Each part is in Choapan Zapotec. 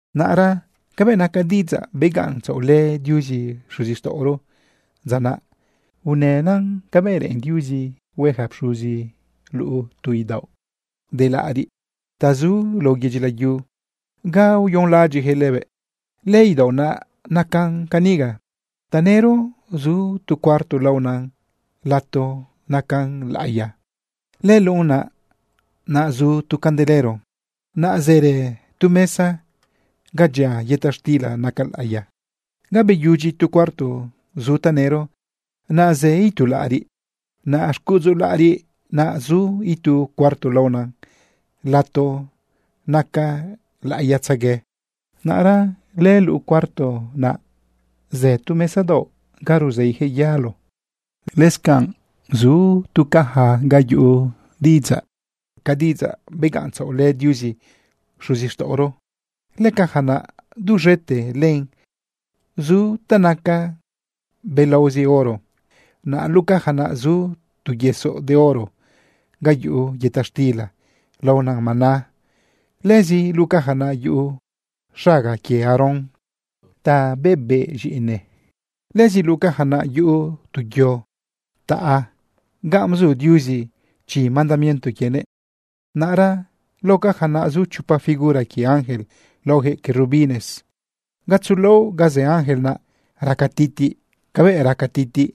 Naꞌra cabëꞌ naca diꞌidzaꞌ begaꞌntzaꞌolë Diuzi xuzixtaꞌoro dza naꞌ, unënan cabëꞌ reꞌen Diuzi hue ja pxuzi luꞌu tu idaoꞌ de laꞌariꞌ ta zu lao yedyi layu ga uyonlaꞌadyiꞌjëꞌ lëbëꞌ. Lëidaoꞌ naꞌ nacan caniga. Tanëro zu tu cuarto laonan Lato Naca Laꞌiya. Lëluꞌunan naꞌ zu tu candelero. Naꞌ zërë tu mesa ga dyia yëta xtila naca laꞌiya. Ga beyudyi tu cuarto zu tanëro, naꞌ zë itu laꞌariꞌ. Naꞌ xcuꞌudzu laꞌariꞌ naꞌ zu itu cuarto laona Lato Naca Laꞌiyatzegue. Naꞌra lëluꞌu cuarto naꞌ zu tu mesa daoꞌ ga ruzeijëꞌ yalo. Lëscanꞌ zu tu caja ga yuꞌu diꞌidzaꞌca diꞌidzaꞌ begaꞌntzaꞌolë Diuzi xuzixtaꞌoro. Lëcaja naꞌ duz̃ete lëꞌën zu ta naca belaozi oro. Naꞌ luꞌu caja naꞌ zu tu yesoꞌ de oro ga yuꞌu yëta xtila laona maná. Lëzi luꞌu caja naꞌ yuꞌu xaga quie Aarón ta bebeꞌz̃iꞌine. Lëzi luꞌu caja naꞌ yuꞌu tu yo taꞌa ganꞌ bzu Diuzi chi mandamiento quienëꞌ. Naꞌra lao caja zu chopa figura quie ángel laojëꞌ querubines. Gatzo laoꞌ ga zë ángel, naꞌ raca titiꞌ cabëꞌ raca titiꞌ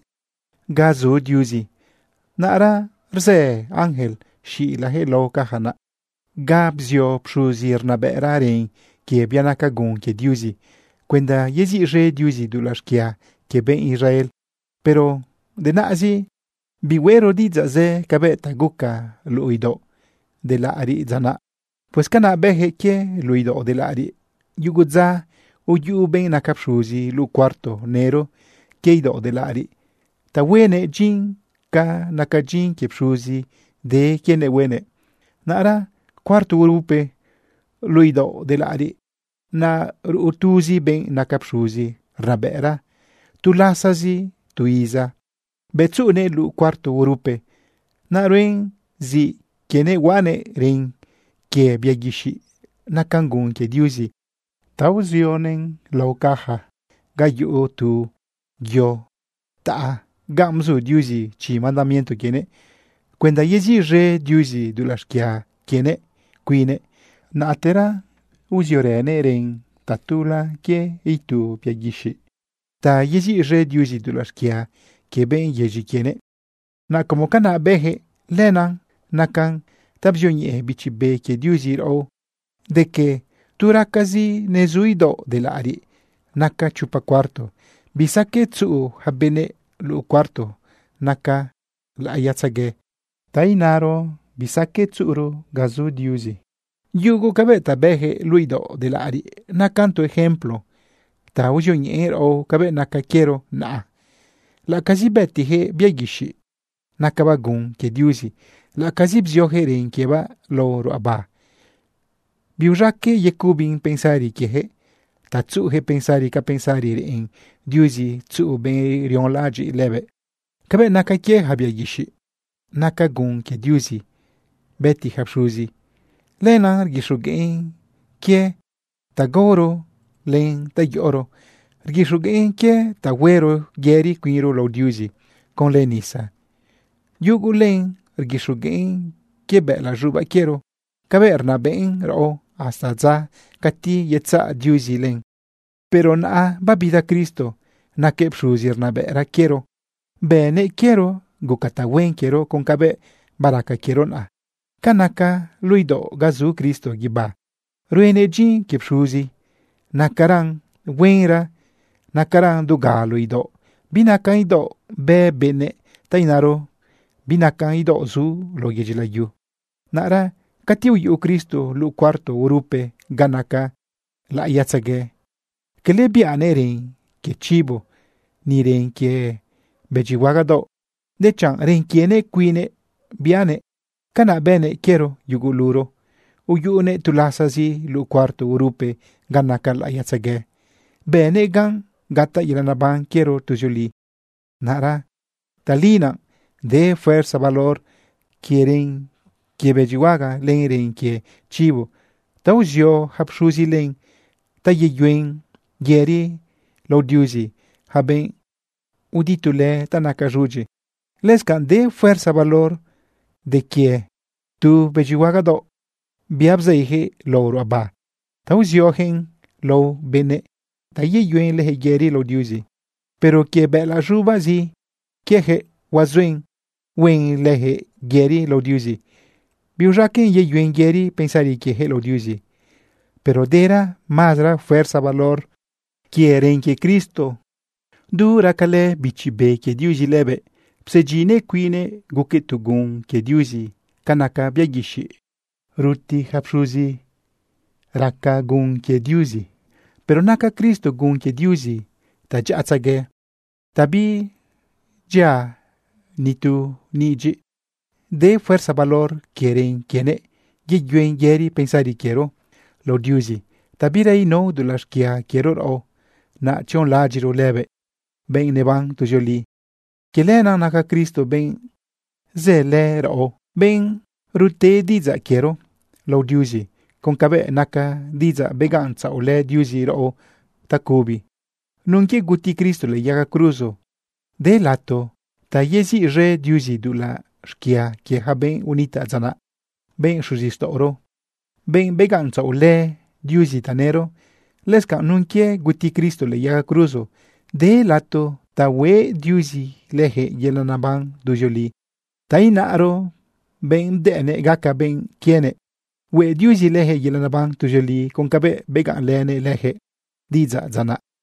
ga zu Diuzi. Naꞌra rzë ángel xilajëꞌ lao caja naꞌ ga bzio pxuzi rnabëꞌra ren quie bia naca gun quie Diuzi cuenda yeziꞌz̃e Diuzi dulaꞌ xquia quie benꞌ Israel. Pero denaꞌzi, bihueꞌro diꞌidzaꞌ zë cabëꞌ ta guca luꞌu idaoꞌ de laꞌariꞌ dza naꞌ. Pues canaꞌ bëjëꞌ quie luꞌu idaoꞌ de laꞌ ariꞌ. Yugu dza uyuꞌu benꞌ naca pxuzi luꞌu cuarto nëro quie idaoꞌ de laꞌariꞌ ta huenëꞌ dyin ca naca dyin quie pxuzi de quienëꞌ huenëꞌ. Naꞌra cuarto urupe luꞌu idaoꞌ de laꞌariꞌ, naꞌ ruꞌu tuzi benꞌ naca pxuzi rnabëꞌra tu lasazi tu iza. Bëꞌ tzuꞌunëꞌ luꞌu cuarto urupe, naꞌ ruen zi quienëꞌ huaꞌanëꞌ ren quie bia guixiꞌ naca gun quie Diuzi ta bzioguëꞌn lao caja ga yuꞌu tu yo taꞌa ganꞌ bzu Diuzi chi mandamiento quienëꞌ cuenda yeziꞌz̃e Diuzi dulaꞌ xquia quienëꞌ cuinnëꞌ. Naꞌtera bziorënëꞌ ren tatula quie itu bia guixiꞌ ta yeziꞌz̃e Diuzi dulaꞌ xquia quie benꞌ yedyi quienëꞌ. Naꞌ como canaꞌ bëjëꞌ, lenaꞌ nacan ta bzioñeꞌe Bichi Be quie Diuzi raꞌo de que tu raca nezu idaoꞌ de laꞌariꞌ naca chopa cuarto, bisaqueꞌ tzuꞌu ja benëꞌ luꞌu cuarto naca laꞌiyatzegue, ta inaro bisaqueꞌ tzuꞌuro ga zu Diuzi. Yugu cabëꞌ ta bëjëꞌ luꞌu idaoꞌ de laꞌariꞌ nacan tu ejemplo ta uzioñeꞌen raꞌo cabëꞌ naca quiero naꞌa. Laꞌacazi bëtijëꞌ bia guixiꞌ nacabaꞌ gun quie Diuzi, laꞌacazi bziojëꞌ ren quiebaꞌ lao ruꞌaba, biuz̃aqueꞌ yecubin pensari quiejëꞌ ta tzuꞌujëꞌ pensari ca pensari reꞌen Diuzi tzuꞌu benꞌ rionlaꞌadyiꞌ lëbëꞌ. Cabëꞌ naca quie yaca bia guixiꞌ naca gun quie Diuzi bëti ja pxuzi, lenaꞌ rguixogueꞌn quie ta gaoro len ta yoꞌoro. Rguixogueꞌn quie ta huero yëri cuinro lao Diuzi conlë nisa. Yugu len rguixogueꞌn quie bëꞌëlaꞌ z̃ubaꞌ quiero cabëꞌ rnabëꞌn raꞌo hasta dza cati yetzaꞌ Diuzi len. Pero naꞌa babida Cristo. Naquëꞌ pxuzi rnabëꞌra quiero. Bënëꞌ quiero guca tahuen quiero con cabëꞌ baraca quiero naꞌa. Ca naca luꞌu idaoꞌ ga zu Cristo guibá ruenëꞌ dyin quie pxuzi, nacaran huenra, nacaran dugalo idaoꞌ. Binaca idaoꞌ bë benëꞌ, ta inaro binaca idaoꞌ zu lao yedyi layu. Naꞌra cati uyuꞌu Cristo luꞌu cuarto urupe ga naca laꞌiyatzegue, cala biꞌanëꞌ ren quie chibo ni ren quie bëdyihuagadaoꞌ, dechanꞌ ren quienëꞌ cuinnëꞌ biꞌanëꞌ. Canaꞌ bënëꞌ quiero yuguluro, uyuꞌunëꞌ tu lasazi luꞌu cuarto urupe ga naca laꞌiyatzegue, bënëꞌ gan gataꞌ yelaꞌ neban quiero tuzioli. Naꞌra tali naꞌ de fuerza valor quie ren quie bëdyihuaga len ren quie chibo ta uzio ja pxuzi len ta yeyuen yëri lao Diuzi yaca benꞌ uditulë ta naca z̃udyi. Lëscanꞌ de fuerza valor quie de quie tu bëdyihuagadaoꞌ, bia bzeijëꞌ lao ruꞌaba ta uziojëꞌn lao benëꞌ ta yeyuen lëjëꞌ yëri lao Diuzi. Pero quie bëꞌëlaꞌ z̃ubaꞌzi quiejëꞌ huazuen huen lëjëꞌ yëri lao Diuzi. Biuz̃aqueꞌn yeyuen yëri pensari quiejëꞌ lao Diuzi. Pero dera mazara fuerza valor quie ren quie Cristo. Du racalë Bichi Be quie Diuzi lëbëꞌ, psedyinnëꞌ cuinnëꞌ guquëꞌ tu gun quie Diuzi ca naca bia guixiꞌ guti ja pxuzi gun quie Diuzi. Pero naca Cristo gun quie Diuzi ta dyaꞌatzegue, ta bidyia ni tu nidyiꞌ. De fuerza valor quie ren quienëꞌ yeyuen yëri pensari quiero lao Diuzi ta bira inao dulaꞌ xquia quiero raꞌo, naꞌ tzionlaꞌadyiꞌro lëbëꞌ, benꞌ neban tuzioli. Quie lenaꞌ naca Cristo benꞌ zëlë raꞌo, benꞌ rute diꞌidzaꞌ quiero lao Diuzi con cabëꞌ naca diꞌidzaꞌ begaꞌntzaꞌolë Diuzi raꞌo tacubi. Nun quie guti Cristo lëꞌë yaga cruzo, de lato ta yeziꞌz̃e Diuzi dulaꞌ xquia quie ja benꞌ unitaꞌ dza naꞌ, benꞌ xuzixtaꞌoro, benꞌ begaꞌntzaꞌolë Diuzi tanëro. Lëscanꞌ nun quie guti Cristo lëꞌë yaga cruzo, de lato ta hueꞌ Diuzi lëjëꞌ yelaꞌ neban tuzioli, ta inaro benꞌ bdëꞌnëꞌ gaca benꞌ quienëꞌ. Hueꞌ Diuzi lëjëꞌ yelaꞌ neban tuzioli con cabëꞌ begaꞌnlënëꞌ lëjëꞌ diꞌidzaꞌ dza naꞌ.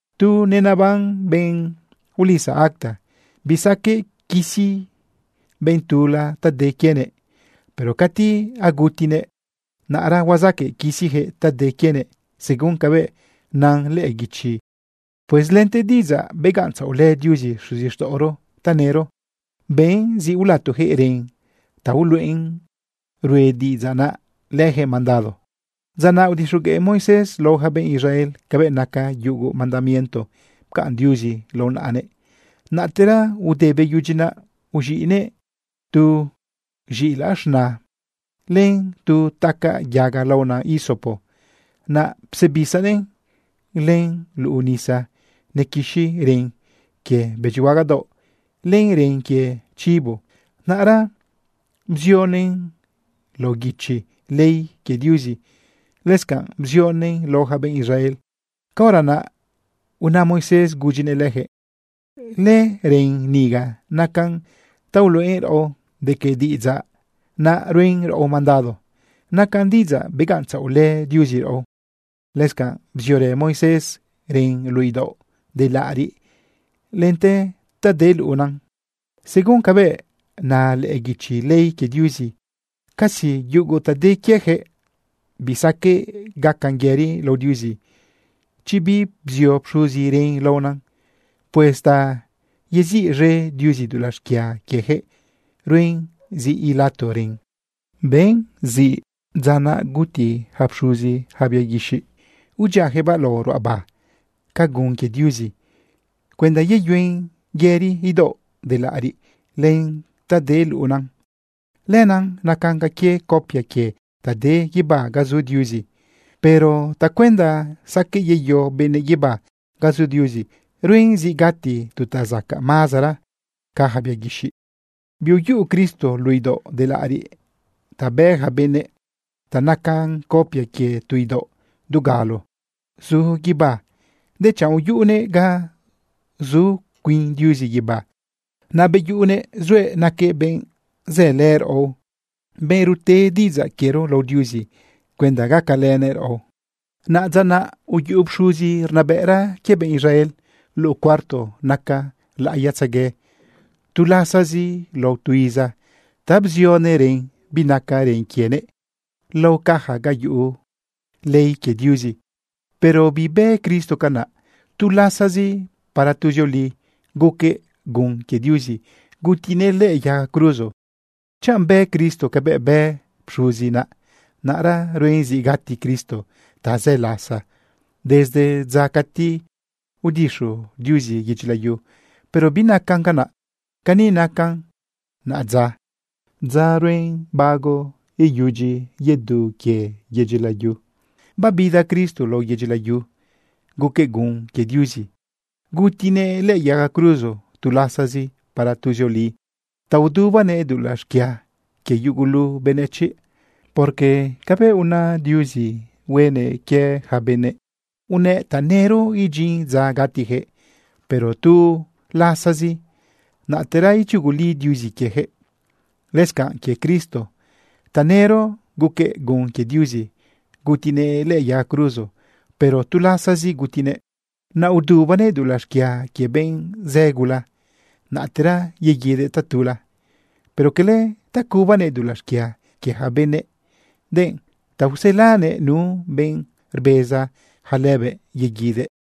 Tu neneban benꞌ ulisa acta, bisaqueꞌ quisi benꞌ tula ta de quienëꞌ. Pero cati agutinëꞌ, naꞌra huazaqueꞌ quisijëꞌ ta de quienëꞌ según cabëꞌ nan lëꞌë guichi. Pues lente diꞌidzaꞌ begaꞌntzaꞌolë Diuzi xuzixtaꞌoro tanëro, ben zi ulatojëꞌ ren ta uluꞌen rue diꞌidzaꞌ naꞌ lëjëꞌ mandado. Dza naꞌ udixogueꞌ Moisés lao ja benꞌ Israel cabëꞌ naca yugu mandamiento pcaꞌn Diuzi lao naꞌanëꞌ. Naꞌtera ude beyudyi naꞌ, uz̃iꞌnëꞌ tu z̃iꞌilaꞌ z̃na len tu tacaꞌ yaga laona hisopo, naꞌ psebisanëꞌ len luꞌu nisa nequixi ren quie bëdyihuagadaoꞌ len ren quie chibo. Naꞌra bzionëꞌn lao guichi ley quie Diuzi. Lëscanꞌ bzionëꞌn lao ja benꞌ Israel. Caora naꞌ una Moisés gudyinëꞌ lëjëꞌ: “Lëren niga nacan ta uluꞌen raꞌo de que diꞌidzaꞌ naꞌ ruen raꞌo mandado. Nacan diꞌidzaꞌ begaꞌntzaꞌolë Diuzi raꞌo.” Lëscanꞌ bziorë Moisés ren luꞌu idaoꞌ de laꞌariꞌ lente ta de luꞌuna. Según cabëꞌ na lëꞌë guichi ley quie Diuzi, casi yugu ta de quiejëꞌ, bisaqueꞌ gacan yëri lao Diuzi chi bibzio pxuzi ren laona. Pues ta yeziꞌz̃e Diuzi dulaꞌ xquia quiejëꞌ, ruen zi ilato ren. Ben zi dza naꞌ guti ja pxuzi yaca bia guixiꞌ udyiajëꞌbaꞌ lao ruꞌaba ca gun quie Diuzi cuenda yeyuen yëri idaoꞌ de laꞌariꞌ len ta de luꞌuna. Lenaꞌ nacan ca quie copia quie ta de guibá ga zu Diuzi. Pero tacuenda saqueꞌ yeyo benëꞌ guibá ga zu Diuzi, ruen zi gati tu ta zacaꞌ mazara ca yaca bia guixiꞌ. Biuyuꞌu Cristo luꞌu idaoꞌ de laꞌariꞌ ta bë ja benëꞌ ta nacan copia quie tu idaoꞌ dugalo zu guibá, dechanꞌ uyuꞌunëꞌ ga zu cuin Diuzi guibá. Naꞌ beyuꞌunëꞌ zuëꞌ naquëꞌ benꞌ zëlë raꞌo, benꞌ rute diꞌidzaꞌ quiero lao Diuzi cuenda gacalënëꞌ raꞌo. Naꞌ dza naꞌ uyuꞌu pxuzi rnabëꞌra quie benꞌ Israel luꞌu cuarto naca laꞌiyatzegue tu lasazi lao tu iza ta bzionëꞌ ren binaca ren quienëꞌ lao caja ga yuꞌu ley quie Diuzi. Pero bibë Cristo canaꞌ. Tu lasazi para tuzioli guquëꞌ gun quie Diuzi gutinëꞌ lëꞌë yaga cruzo. Chanꞌ bë Cristo cabëꞌ bë pxuzi naꞌ, naꞌra ruen zi gati Cristo tazë lasa desde dza cati udixu Diuzi yedyi layu. Pero binacan canaꞌ. Cani nacan naꞌadza dza ruen bago iyudyi yedu quie yedyi layu: Babida Cristo lao yedyi layu guquëꞌ gun quie Diuzi gutinëꞌ lëꞌë yaga cruzo tu lasazi para tuzioli ta udubanëꞌ dulaꞌ xquia quie yugulu benëchiꞌ. Porque cabëꞌ una Diuzi huenëꞌ quie ja benëꞌ, unëꞌ tanëro idyin dza gatijëꞌ, pero tu lasazi, naꞌtera ichuguli Diuzi quiejëꞌ. Lëscanꞌ quie Cristo, tanëro guquëꞌ gun quie Diuzi gutinëꞌ lëꞌë yaga cruzo, pero tu lasazi gutinëꞌ, naꞌ udubanëꞌ dulaꞌ xquia quie benꞌ zë gula. Naꞌtera yeguidëꞌ tatula, pero cala ta cubanëꞌ dulaꞌ xquia quie ja benëꞌ, denꞌ ta uselanëꞌ nu benꞌ rbeza ja lëbëꞌ yeguidëꞌ.